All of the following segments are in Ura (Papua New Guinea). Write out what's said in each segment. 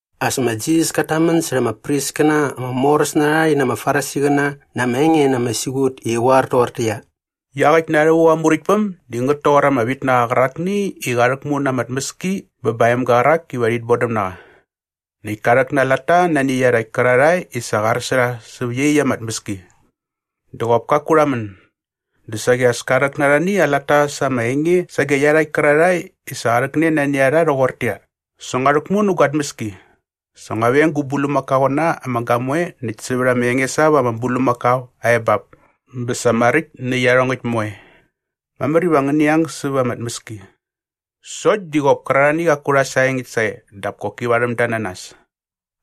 As ma Jisas kat tamän särha ama priskäna ama moräs na rha rhi na ama Farisiqäna na ama enge na ama siqut i qä qoar toqortäqyia, “Iaqäkt na rhävuk aa Muräktpäm di ngät toqor ama vitnaqa qärakni i qa rhäkmu na ama tmäski bä ba aa emga qärak iva rhit bodäm na qa. Näkt ka rhäk na aa latta nani iarhakt kärarhae i sa qa ar sä rha säp iaqyäkt ama tmäski. Dä qop kaku rha män. Dä saqi as ka rhäk na arhani aa latta sa ama enge sage iarhakt kärarhae i sa qa rhäkne nani a rha rhoqortäqyia, ‘Sa ngua rhäkmu nä gua tmäski. Sa ngua veng gu bulmakaoqäna ama gamoe näkt sävät ama enges ap ama bulmakao aa ebap bä sa maräkt nä iarhongäkt moe. Mamär iva ngäni ang säva ama tmäski.’ “Sokt di qop kärarhani qaku rha saengäkt sae dap koki varhäm da na nas.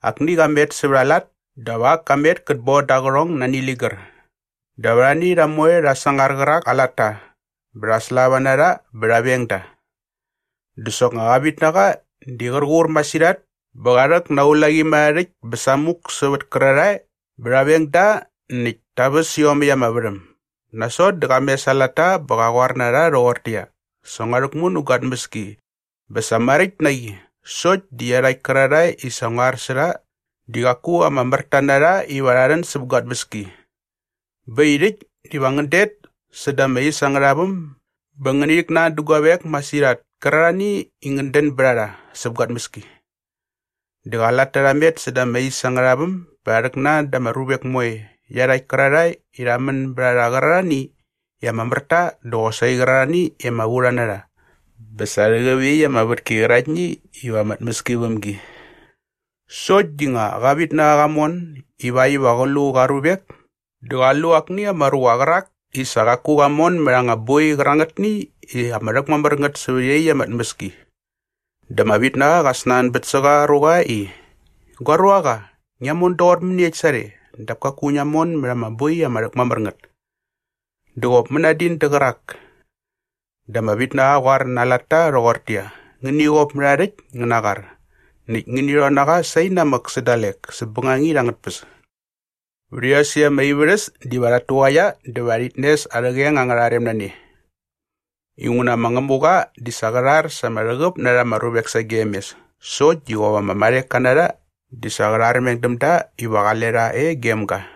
Akni qa met sävät aa lat dap ak ka met kät bon da aa qärhong nani ligär. Dap arhani rha moe rha sangar qärak aa latta bä rha slava na rha bä rha veng da. “Dä soknga qa vitnaqa di qär qur masirhat bä qa rhäk na aa ulaqimärharhärhäkt bä samuk sävät kärarhae bä rha veng da näkt ta väs iomäkt arha värhäm. Nasot dä qa mes aa latta bä qa qoar na rha rhoqortäqyia, ‘Sa ngua rhäkmu nä gua tmäski bä sa maräkt na qi sokt di iarhakt kärarhae i sa ngua ar sä rha di qaku ama mär ta na rha iva rha rhän säp gua tmäski. Bä äkt i rhäkt diva ngän det säda ama is angärha väm bä ngäni rhäknan dä guavek masirhat kärarhani i ngän dän bät a rha säp gua tmäski.’ Dä qa latta rha met säda ama is angärha väm bä rha rhäknan da ama ruvek moe iarhakt kärarhae i rha män bät a rha qärarhani i ama mär ta dä qosaqi qärarhani i ama vu rha na rha bä sa rhäqäp iaqyäkt ama vätki qäraktni iva ama tmäski väm gi. “Sokt di nga qa vitnaqa qa mon ivakt iva qä lu qa ruvek dä qa lu akni ama ruqa qärak i sa qaku qa mon mät anga boi qärangätni i ama rhäkmamär ngät sävät iaqyäkt ama tmäski. Dä ama vitnaqa qa snanbät sä qa ruqa i, ‘Gua ruaqa, ngia mon doqor mäniekt sarhe dap kaku ngia mon mät ama boi ama rhäkmamär ngät?’ Dä qop mänadin dä qärak. Dä ama vitnaqa qa qoar na aa latta rhoqortäqyia, ‘Ngäni qop mät aa rhäkt ngä na aa qar näkt ngäni rhon na qa sainamäk sä dalek säp bängangit angät tpäs. Vät iosäkt ama ivärhäs diva rhat tuqaia dä va rhit nes arhä qeng angärha rem na ne.’ Inguna ma Ngämuqa di sa qä rhar sa ama rhäqäp na rha ama ruvek sagem mes sokt di qop ama marheka na rha di sa qä rharmeng däm da iva qale rha e gem ga.”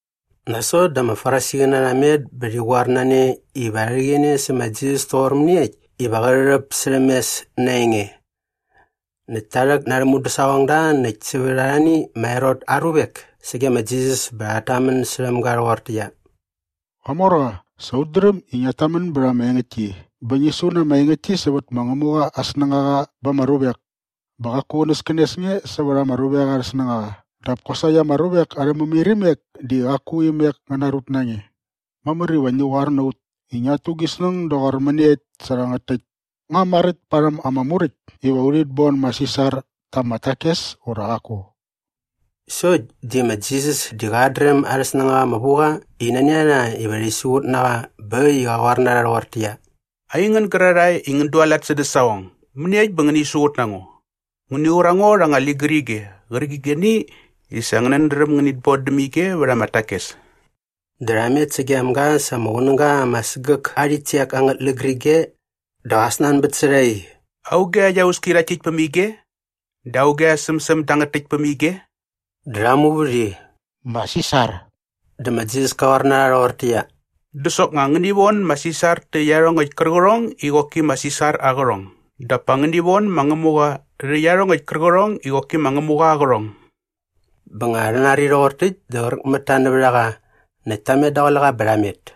Nasot dä ama Farisiqäna rha met bä rhi qoar na ne iva rha rhäqäne sä ma Jisas toqor mäniekt iva qä rhärhäp särhäm mes na aa enge. Näkt ta rhäk na arhä mudäsaqongda näkt sävät arhani ma Herot aa ruvek sage ma Jisas bä rhat tamän särhäm ga rhoqortäqyia, “Qamorqa, sa ut dräm i ngiat tamän bät ama engäktki bä ngi su na ama engäktki sävät ma Ngämuqa aa snängaqa ba ama ruvek. Bä qaku qänäskänes nge sävät ama ruvek arhä snängaqa dap kosaqi ama ruvek arhä mämairimek di qaku imek ngä narut na nge. Mamär iva ngi qoar na ut i ngiat tu gi snäng doqor mäniekt sä rhangät täkt. Nga maräkt parhäm ama Muräkt iva urhit bon ma Sisar ta ama takes ura qaku?” Sokt di ma Jisas di qat dräm arhä snängaqa ama vu qa i nani a rha iva rhi siqut na qa bä äkt i qa qoar na rha rhoqortäqyia, “Aingän gärarhae i ngän dualat sädä saqong, mäniekt bä ngäni siqut na ngo? Ngäni qur a ngo rha anga ligärige qärqigeni i sa ngänät dräm ngänit bon däm ige vät ama takes.” Dä rha met sagem ga sa ama qunäga ama sägäk aa rhitsek angät ligärige. Dä qa snanbät sä rha i, “Auge aa iauski rhakt täkt päm ige? Dä auge aa sämsäm dangät täkt päm ige?” Dä rha muvät i, “Ma Sisar.” Dä ma Jisas ka qoar na rha rhoqortäqyia, “Dä soknga ngäni von ma Sisar tä iarhongäkt kärqärhong i qoki ma Sisar aa qärhong dap pa ngäni von ma Ngämuqa rhä iarhongäkt kärqärhong i qoki ma Ngämuqa aa qärhong.” Bä nga rha nari rhoqor täkt dä qräk mät ta nävät a qa näkt ta met daqule qa bä rha met.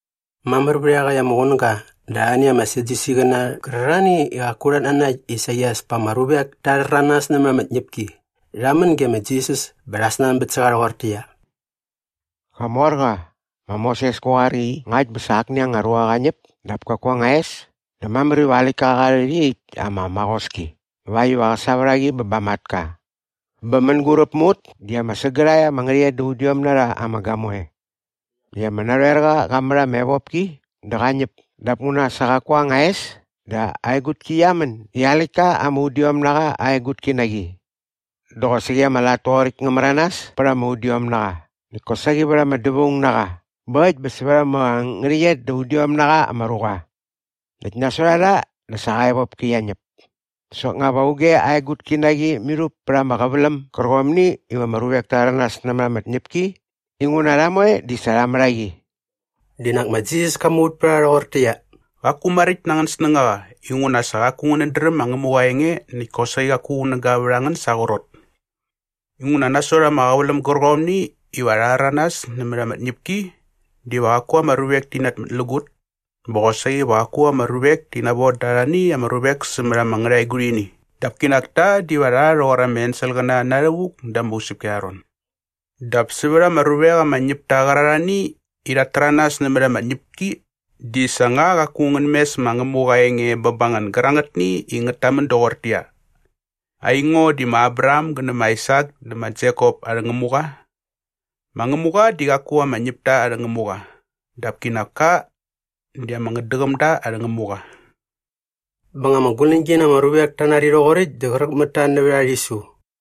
Mamär vät iaqäkt ama qunäga dä arhani ama Sadyusiqäna qärarhani i qaku rhat nanakt i saqi as pa ama ruvek ta rhäranas nämät ama tñäpki rha män ge ma Jisas bä rha snanbät sä qa rhoqortäqyia, “Qamorqa, ma Moses ka qoar i ngakt bä sa akni anga ruqa qa ñäp dap kaku aa anga es dä mamär iva aa läktka qa rhät iaqyäkt ama maqoski ivakt iva qä sa vät a qi bä ba aa matka. “Bä mänguräp mä ut di ama sägärhae ama ngärhäqyet da udiom na rha ama gamoe. Näkt ama narhoerqa qa mät ama evopki dä qa ñäp dap nguna sa qaku aa anga es dä aa egutki qia män i aa läktka ama udiom na qa aa egutki na qi. Dä qosaqi ama lat toqoräkt ngä märanas bät ama udiomnaqa näkt kosaqi vät ama dävaungnaqa bä äkt bä sävät ama ngärhäqyet da udiom na qa ama ruqa. Näkt nasot a rha dä sa qa evopki qia ñäp. Dä soknga va auge aa egutki na qi mirhup pät ama qäväläm gärqomni iva ama ruvek ta rhäranas nämät ama tñäpki? Inguna rha moe di sa rha mät a qi.” Dä qinak ma Jisas ka muvät pät a rha rhoqortäqyia, “Qaku maräkt na angän snängaqa inguna sa qaku ngänät dräm ma Ngämuqa aa enge näkt kosaqi qaku qunäga vät a ngän sa aa qrot. Inguna nasot ama qäväläm gärqomni iva rha rhäranas nämät ama tñäpki diva qaku ama ruvek ti namätlägut bä qosaqi va qaku ama ruvek ti navon da arhani ama ruvek sämät ama ngärhaegurhini dap kinak ta diva rha rhoqor ama enselqäna na rhävuk da ama usäpki arha ron. Dap sävät ama ruvek ama ñäp ta qärarhani i rhat täranas nämät ama tñäpki di sa nga qaku ngän mes ma Ngämuqa aa enge bä ba ngän gärangätni i ngät tamän doqortäqyia, ‘Aingo di ma Abraham gä nä ma Aisak dä ma Jekop arhä Ngämuqa’? Ma Ngämuqa di qaku ama ñäpta arhä Ngämuqa dap kinak ka di ama ngätdäqämda arhä Ngämuqa.” Bä nga ama guläñgi na ama ruvek ta nari rhoqoräkt dä qräk mät ta nävät aa rhisu.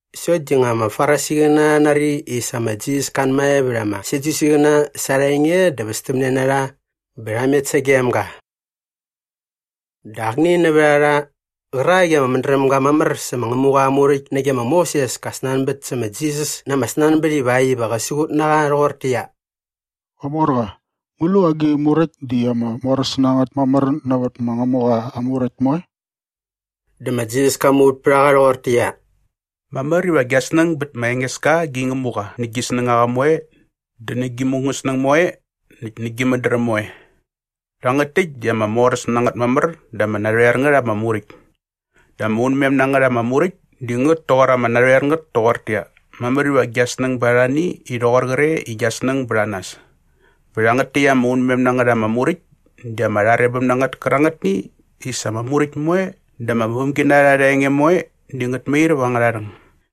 Sokt di nga ama Farisiqäna rha nari i sa ma Jisas ka anmae vät ama Sadyusiqäna sa arha enge dä västämne na rha bä rha met sagem ga. Dä akni nävät a rha qärak i ama mädräm ga mamär sä ma Ngämuqa aa Muräkt nage ma Moses ka snanbät sä ma Jisas na ama snanbät ivakt iva qä siqut na qa rhoqortäqyia, “Qamorqa, ngu lu agi muräkt di ama moräs na ngät mamär nävät ma Ngämuqa aa Muräkt moe?” Dä ma Jisas ka muvät pät a qa rhoqortäqyia, “Mamär iva gia snäng bät ma Engeska gi Ngämuqa nä gi snängaqa moe dä nä gi mungäsnäng moe näkt nä gi mädräm moe. Rhangät täkt di ama moräs na ngät mamär dä ama narhoer ngät ama muräkt. Dä ama unmem na ngät ama muräkt di ngät toqor ama narhoer ngät toqortäqyia, mamär iva gia snäng bät arhani i rhoqor qre i gia snäng bät a nas. Bä rhangät täkt ama unmem na ngät ama muräkt di ama rharebäm na ngät kärangätni i sa ama muräkt moe dä ama vämginarha arha enge moe di ngät mair vät angärha rhäng.”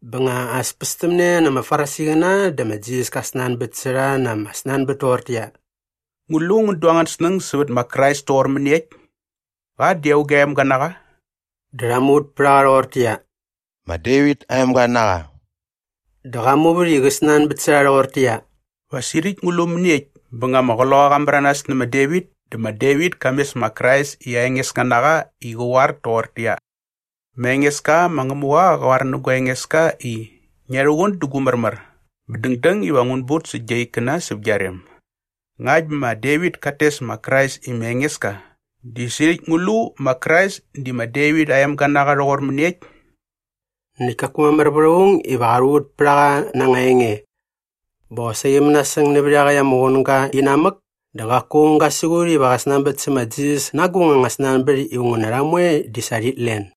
Bä nga as pästämne na ama Farisiqäna dä ma Jisas ka snanbät sä rha na ama snanbät toqortäqyia, “Ngu lu ngän du angän snäng sävät ma Krais toqor mäniekt? Qa di auge aa emga na qa?” Dä rha muvät pät a qa rhoqortäqyia, “Ma Devit aa emga na qa.” Dä qa muvät i qä snanbät sä rha rhoqortäqyia, “Va sirhäkt ngu lu mäniekt bä nga ama Qloqaqa qa märanas nä ma Devit dä ma Devit ka mes ma Krais i aa Engeska na qa i qä qoar toqortäqyia, “‘Ma Engeska ma Ngämuqa qa qoar nä gua Engeska i, “Ngia rhuqun dä gu märmär bä dängdäng iva ngun but sä gia ikkäna säp gia rem”’? Ngakt bä ma Devit kat tes ma Krais i ma Engeska dä sirhäkt ngu lu ma Krais di ma Devit aa emga na qa rhoqor mäniekt?” Näkt kaku mamär vät aung iva qa rhuvät pät a qa na anga enge. Bä qosaqi mänasäng nävät iaqäkt ama qunäga inamäk dä qaku aung ga siqut iva qä snanbät sä ma Jisas na agung anga snanbät inguna rha moe di sa rhit len.